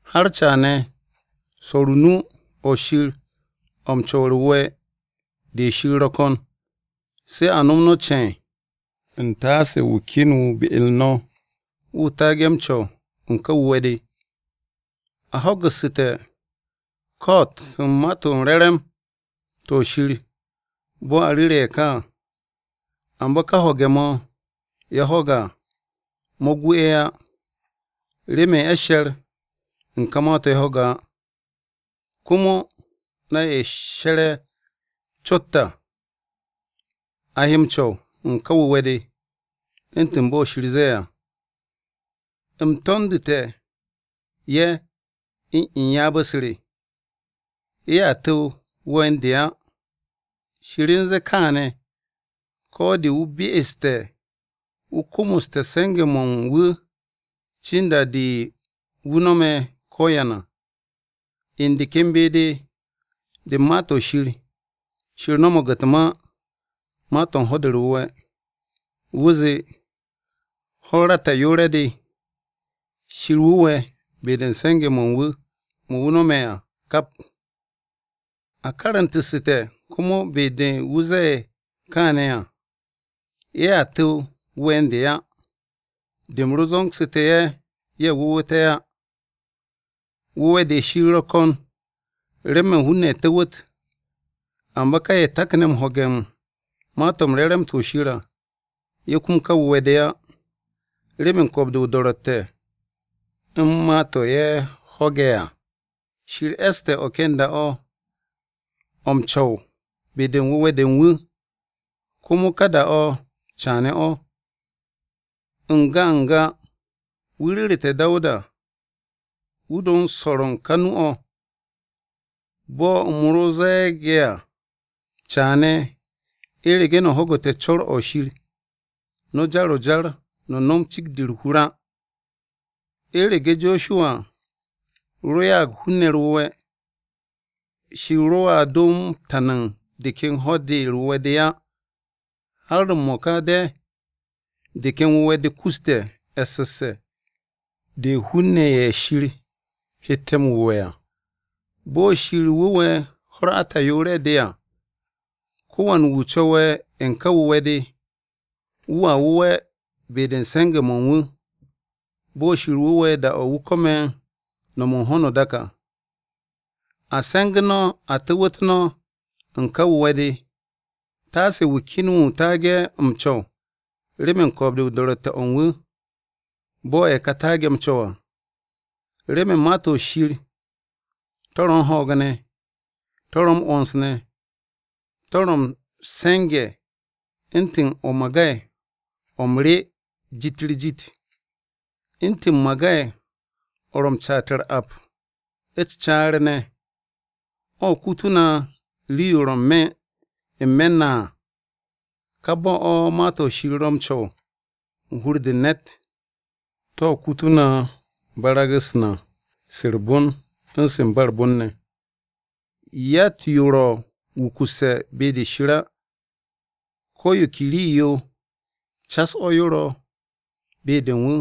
Har caane̱ swo̱r o-nu o̱ Shir o̱ m-co̱w u̱r-wu̱we̱ de Shir ro̱ ko̱n. Se̱ a no̱m no̱ ce̱e̱n, u̱ntaase wu̱ ken wu̱ be-u̱r no̱, wu̱ taage̱ m-co̱w u̱n ká wu̱we̱-de. A ho̱gu̱ssu̱te̱ ko̱'o̱t u̱n Ma-to̱ m-Re̱re̱m to̱ Shir bo̱ a ru̱ru̱ ye̱ ka à. Amba ka ho̱ge̱-mo̱ ye̱ ho̱ge̱ à, mo̱ gu ye̱ á, remen ye̱ she̱r u̱n ka ma-to̱ ye̱ ho̱ge̱ á. Komo, na ye̱ she̱re̱ à cot, a he m-co̱w u̱n ká wu̱we̱-de. U̱ntu̱n bo̱ Shir zee à, “U̱m to̱ndu̱tu̱ ye̱ u̱n ryaab-u̱s re. ‘Ye̱a tu̱w wu̱we̱ u̱n de á.’” Shir u̱n zee kaane̱ ko̱ de wu̱ be'este̱ wu̱ komoste̱ se̱nge̱-mo̱ u̱n wu̱ cin da-de wu̱ nome̱ ko̱yan à. U̱n de ken be-de de u̱n Ma-to̱ Shir, Shir no̱mo̱g u̱t-ma, ma-to̱ u̱n Ho̱-de u̱r-Wu̱we̱, wu̱ zee, “Ho̱-u̱r ata'yoore̱-de, Shir wu̱we̱ be-de u̱n se̱nge̱-mo̱ u̱n wu̱ mo̱ wu̱ no̱me̱ à kap.” A karu̱ntu̱ssu̱te̱ komo be-de wu̱ zee kaane̱ à, “Ye̱a tu̱w wu̱we̱ u̱n de á, de u̱m ro zo̱ngsu̱tu̱ ye̱, ye̱ wu̱wu̱te̱ á.” Wu̱we̱-de Shir ro̱ ko̱n remen hun-ne̱ tu̱wu̱t, amba ka ye̱ takne̱ m-ho̱ge̱ u̱n Ma-to̱ m-Re̱re̱m to̱ Shir à, ye̱ kum ka wu̱we̱-de á remen ko̱o̱b-de o-do̱ro̱tte̱ u̱n ma-to̱ ye̱ ho̱ge̱ à. Shir e̱ste̱ o̱ ken da-o̱ o̱ m-co̱w be-de u̱n wu̱we̱-de u̱n wu̱, komo ka da-o̱ caane̱ o̱. N-ga n-ga, wu̱ ru̱ru̱te̱ Dawuda wu̱ do swo̱r u̱n ka nu-o̱, bo̱ u̱m ro ze̱e̱ge̱ à, “Caane̱, u̱rege̱ no̱ ho̱gu̱te̱ co̱r-o̱ Shir, no̱ jar-o jar no̱ nom cikt-de u̱r-hur á.” U̱rege̱ Josuwa ro ya'ag hun-ne̱ u̱r-wu̱we̱, Shir roa do m-tan u̱n de ken Ho̱-de u̱r-Wu̱we̱ de á. Har m-mo̱ka de̱ de ken wu̱we̱-de kuste̱ e̱ssesse̱ de hun-ne̱ ye̱ Shir hette̱ m-wu̱we̱ à, bo̱ Shir wu̱we̱ ho̱-u̱r ata'yoore̱-de à. Ko̱wan wu̱ co̱we̱ u̱n ká wu̱we̱-de, wu̱a wu̱we̱ be-de u̱n se̱nge̱-mo̱ u̱n wu̱, bo̱ Shir wu̱we̱ da-o̱ wu̱ ko̱me̱ no̱m u̱n ho̱no o-dak à. A se̱ngu̱ no̱ a tu̱wu̱t no̱ u̱n ká wu̱we̱-de. Taase wu̱ ken wu̱ taage̱ m-co̱w remen ko̱o̱b-de u̱n do̱ro̱tte̱-o̱ u̱n wu̱, bo̱ ye̱ ka taage̱ m-co̱w à. Remen Ma-to̱ Shir to̱ ro̱ u̱n ho̱o̱g ne̱. To̱ ro̱ m-'wo̱ns ne̱. To̱ ro̱ m-se̱nge̱ u̱ntu̱n o-magay o̱ m-rye jit-u̱r-jit. U̱ntu̱n magay-o̱ ro̱ m-caat u̱r-ap u̱t-caar ne̱, o̱ kutu̱ na rii-yo ro̱ n-me̱ na à, ka bo̱-o̱ Ma-to̱ Shir ro̱ m-co̱w u̱n hur-de u̱n ne̱t, to̱ kutu̱ na barag-u̱s na se u̱r-bon u̱n se u̱n ba u̱r-bon ne̱. Yatt-yo ro̱ wukusse̱ be-de Shir á. Ko̱ yo ke rii-yo cas o̱ yo ro̱ be-de u̱n wu̱,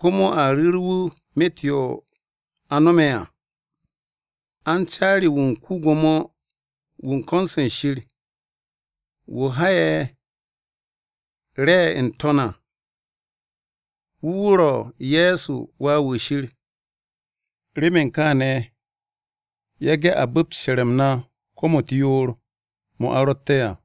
komo a ru̱ru̱ wu̱ myet yo a no̱me̱ à. A u̱n caari-wu̱ u̱n ko-Gwo̱mo-wu̱ u̱n ko̱n-se Shir, wu̱ ha'e̱ re̱ n-To̱n à, wu̱ wu̱ ro̱ Ye̱so Wà-wu̱ Shir. Remen kaane̱ yage̱ a bu̱pt she̱r-m na u̱t-kom u̱t-yoor to̱ a ro̱tte̱ à.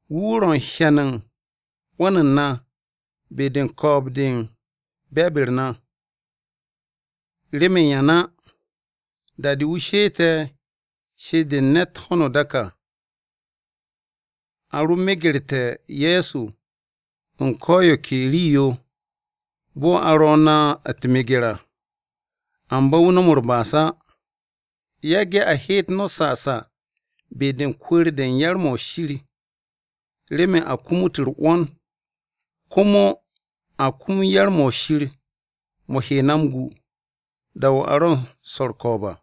Wu̱ wu̱ ro̱ u̱n hyan u̱n 'wo̱n u̱n na be-de u̱n ko̱o̱b-de u̱n be̱e̱b-u̱r na. Remen yan á, da-de wu̱ she'ete̱ she'et-de u̱n ne̱t ho̱no o-dak à, a ro megerte̱ Ye̱so u̱n ko̱ yo ke rii-yo bo̱ a ro̱ na u̱t-meger à, amba wu̱ no̱m u̱r-ba'as á. Yage̱ a heet no̱ sasa be-de u̱n kwu̱u̱r-de u̱n yar-mo̱ Shir, remen a kumut u̱r-'wo̱n komo a kum yar-mo̱ Shir mo̱ he na m-gu da-o̱ a ro̱ m-swo̱ u̱r-ko̱o̱b à.